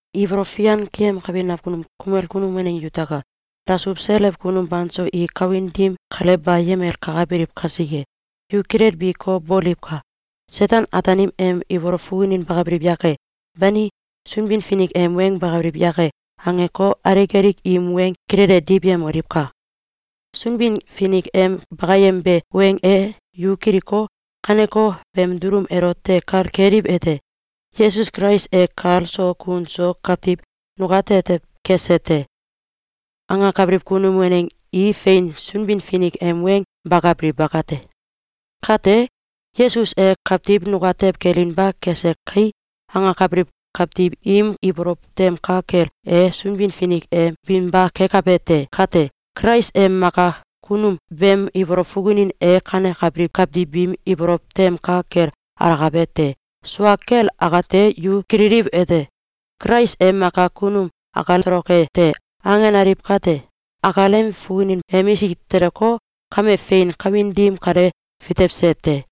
Ibolow fian keyemkabi nakunum kumel kunum waneng yutaka! Dasuw selew kunum banso i kawin dim kale bayemel kakabiliw kasike, yu kilelbiko, boliwka! “Seten-Ataanim em ibolow fukunin bakabiliw yake? Bani, Sunbin-Finik em weng bakabiliw yake?”, angeko, alik alik im weng kilele diwyemoliwka! Sunbin-Finik em bakayembe weng e yu kiliko, kaneko beem dulum elote kal keliwete: “Yesus Kulais e kal so kun so kawtiw nukatetew kese te!”, angakabiliw kunum waneng i fein Sunbin-Finik em weng bakabiliw bakate. Kate, “Yesus e kawtiw nukatew kelinba kese kai!”, angakabiliw kawtiw im ibolow tem ka kel e Sunbin-Finik e binba kekabe kate, Kulais em Maka Kunum beem ibolow fukunin e kanekabiliw kawtiw biim ibolow tem ka kel alakabe te. Sua kel akate, yu kililiwete: “Kulais em Maka Kunum akal toloke te!”, angenaliw kate, akalem fukunin emisik teleko, kame fein kawin dim kale fitewse te.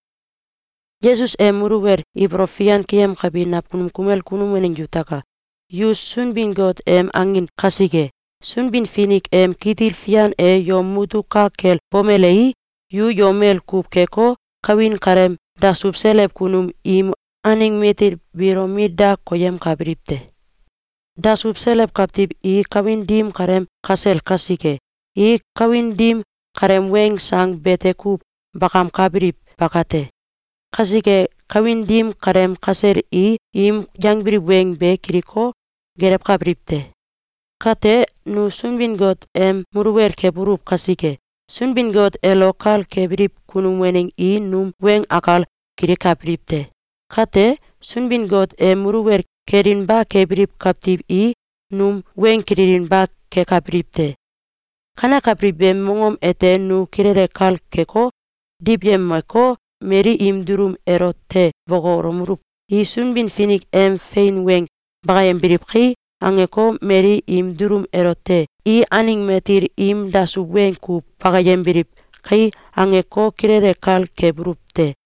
Yesus em muluwel ibolow fian keyemkabi nakunum kumel kunum waneng yutaka! Yu Sunbin-Got em angin kasike, Sunbin-Finik em kitil fian e yom mutuk ka kel bomelei, yu yomel kuw keko, kawin kaleem dasuw selew kunum im aneng matil biilo mit da koyemkabiliw te. Dasuw selew kawtiw i kawin dim kaleem kasel kasike, i kawin dim kaleem weng sang bete kuw bakamkabiliw bakate. Kasike, kawin dim kaleem kasel i im yangbiliw weng be kiliko, gelewkabiliw te. Kate, nu Sunbin-Got em muluwel kebuluw kasike, Sunbin-Got elo kal kebiliw kunum waneng i num weng akal kilikabiliw te. Kate, Sunbin-Got em muluwel kelinba kebiliw kawtiw i num weng kililinba kekabiliw te. Kanekabiliw beem mongom ete nu kilele kal keko, diwyemeko, mali im dulum elote bokolomeluw: “I Sunbin-Finik em fein weng bakayembiliw kai!”, angeko, mali im dulum elote “I aneng matil im dasuw weng kuw bakayembiliw kai!”, angeko, kilele kal kebuluw te.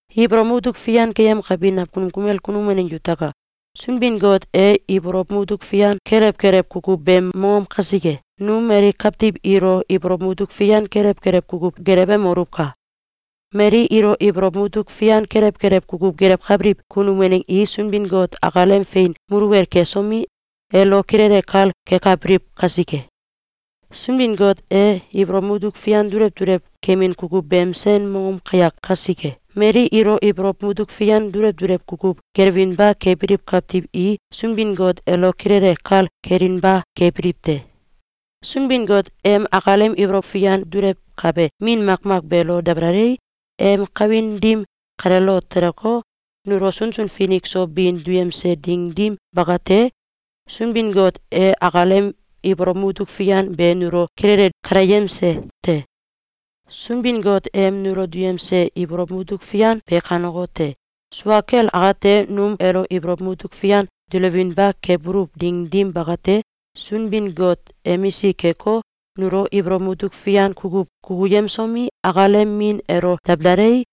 Ibolow mutuk fian keyemkabi nakunum kumel kunum waneng yutaka! Sunbin-Got e ibolow mutuk fian kelew kelew kukuw beem mongom kasike, nu mali kawtiw ilo ibolow mutuk fian kelew kelew kukuw gelewemoluwka! Mali ilo ibolow mutuk fian kelew kelew kukuw gelewkabiliw kunum waneng i Sunbin-Got akalem fein muluwel kesomi, elo kilele kal kekabiliw kasike. Sunbin-Got e ibolow mutuk fian dulew dulew kemin kukuw beem sen mongom kayak kasike, mali ilo ibolow mutuk fian dulew dulew kukuw gelewinba kebiliw kawtiw i Sunbin-Got elo kilele kal kelinba kebiliw te. Sunbin-Got em akalem ibolow fian dulewkabe Min makmak beelo dabalalei, em kawin dim kaleelo teleko, nulo sunsun finik so bin duyemse ding dim bakate, Sunbin-Got e akalem ibolow mutuk fian be nulo kilele kaleyemse te. Sunbin-Got em nulo duyemse ibolow mutuk fian be kanekote: Sua kel akate, num elo ibolow mutuk fian dulewinba kebuluw ding dim bakate, Sunbin-Got emisik keko, nulo ibolow mutuk fian kukuw kukuyemsomi, akalem min elo dabalalei,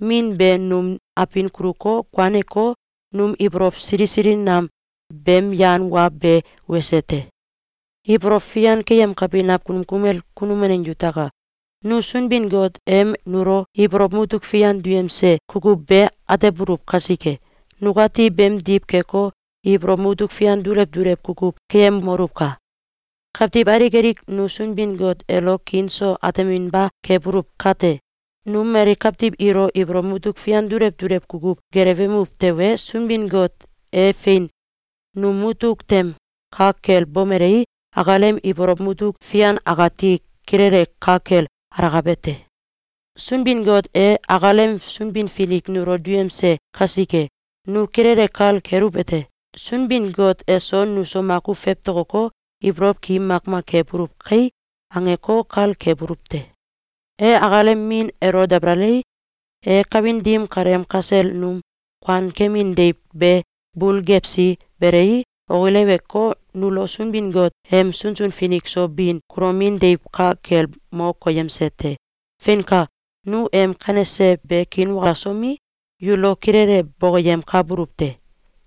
Min be num abin kuluko, kuaneko, num ibolow sili sili nam beem yan wa be wese te. Ibolow fian keyemkabi nakunum kumel kunum waneng yutaka! Nu Sunbin-Got em nulo ibolow mutuk fian duyemse kukuw be atebuluw kasike, nukati beemdiw keko, ibolow mutuk fian dulew dulew kukuw keyemoluwka! Kawtiw alik alik nu Sunbin-Got elo kiin so ateminba kebuluw kate, nu mali kawtiw ilo ibolow mutuk fian dulew dulew kukuw gelewemuw tewe, Sunbin-Got e fein num mutuk tem ka kel bomelei, akalem ibolow mutuk fian akati kilele ka kel alakabe te. Sunbin-Got e akalem Sunbin-Finik nulo duyemse kasike, nu kilele kal keluwete: “Sunbin-Got eso nuso makuw fewtokoko, ibolow ki makmak kebuluw kai!”, angeko, kal kebuluw te. E akalem Min elo dabalalei, e kawin dim kaleem kasel num kuankemin deiw be bul gewsi belei, okileweko, nulo Sunbin-Got em sunsun finik so bin kulomin deiw ka kel mo koyemse te. Feinka! Nu em kanese be kiinwalasomi, yulo kilele bokoyemkabuluw te.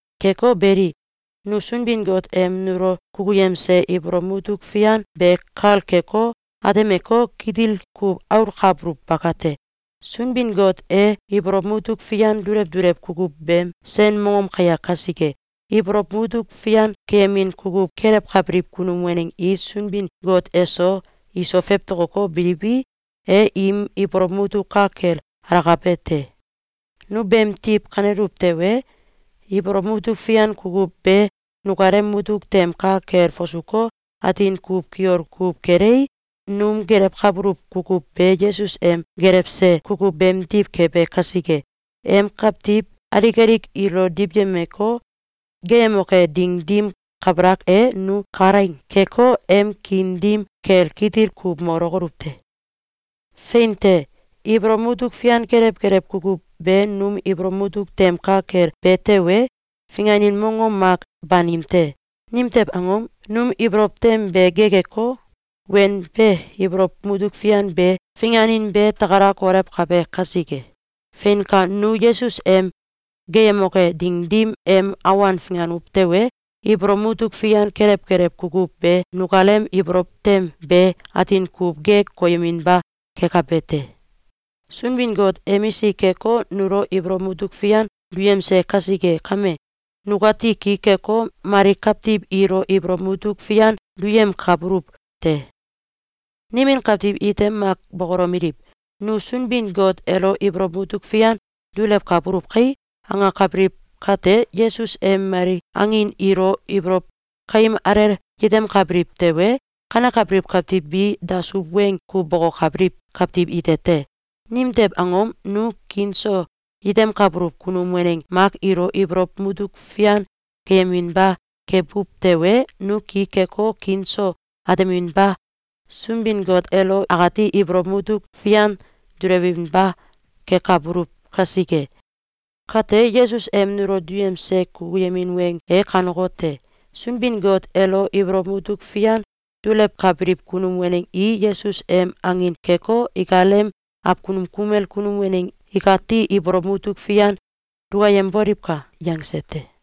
Keko beli, nu Sunbin-Got em nulo kukuyemse ibolow mutuk fian be kal keko, atemeko, kitil kuw aulkabuluw bakate. Sunbin-Got e ibolow mutuk fian dulew dulew kukuw beem sen mongom kayak kasike, ibolow mutuk fian keyemin kukuw kelewkabiliw kunum waneng i Sunbin-Got eso iso fewtokoko, biliwi, e im ibolow mutuk ka kel alakabe te. Nu beemdiw kaneluw tewe, ibolow mutuk fian kukuw be nukalem mutuk tem ka kel fasuko, atin kuw kiol kuw kelei, num gelewkabuluw kukuw be Yesus em gelewse kukuw beemdiw kebe kasike, em kawtiw alik alik ilo diwyemeko, geeyemoke ding dim kabalak e, nu kalaing keko, em kiin dim kel kitil kuw molokoluw te. Fein te! Ibolow mutuk fian kelew kelew kukuw be num ibolow mutuk tem ka kel be tewe, finganin mongom mak banim te. Nimtew angom? Num ibolow tem be gekeko, wenbe ibolow mutuk fian be finganin be takala kolewkabe kasike. Feinka! Nu Yesus em geeyemoke ding dim em awan finganuw tewe, ibolow mutuk fian kelew kelew kukuw be nukalem ibolow tem be atin kuw gek koyeminba kekabe te. Sunbin-Got emisik keko, nulo ibolow mutuk fian duyemse kasike kame, nukati ki keko, mali kawtiw ilo ibolow mutuk fian duyemkabuluw te. Nimin kawtiw ite mak bokolomeliw: “Nu Sunbin-Got elo ibolow mutuk fian dulewkabuluw kai!”, angakabiliw kate, Yesus em mali angin ilo ibolow kaim alel yetemkabiliw tewe, kanekabiliw kawtiw bi dasuw weng kuw bokokabiliw kawtiw ite te! Nimtew angom? Nu kiin so yetemkabuluw kunum waneng mak ilo ibolow mutuk fian duyeminba kebuw tewe, nu ki keko, kiin so ateminba Sunbin-Got elo akati ibolow mutuk fian dulewinba kekabuluw kasike. Kate, Yesus em nulo duyemse kukuyemin weng e kanekote: “Sunbin-Got elo ibolow mutuk fian dulewkabiliw kunum waneng i Yesus em angin keko, ikalem awkunum kumel kunum waneng ikati ibolow mutuk fian dukayemboliwka!”, yangse te.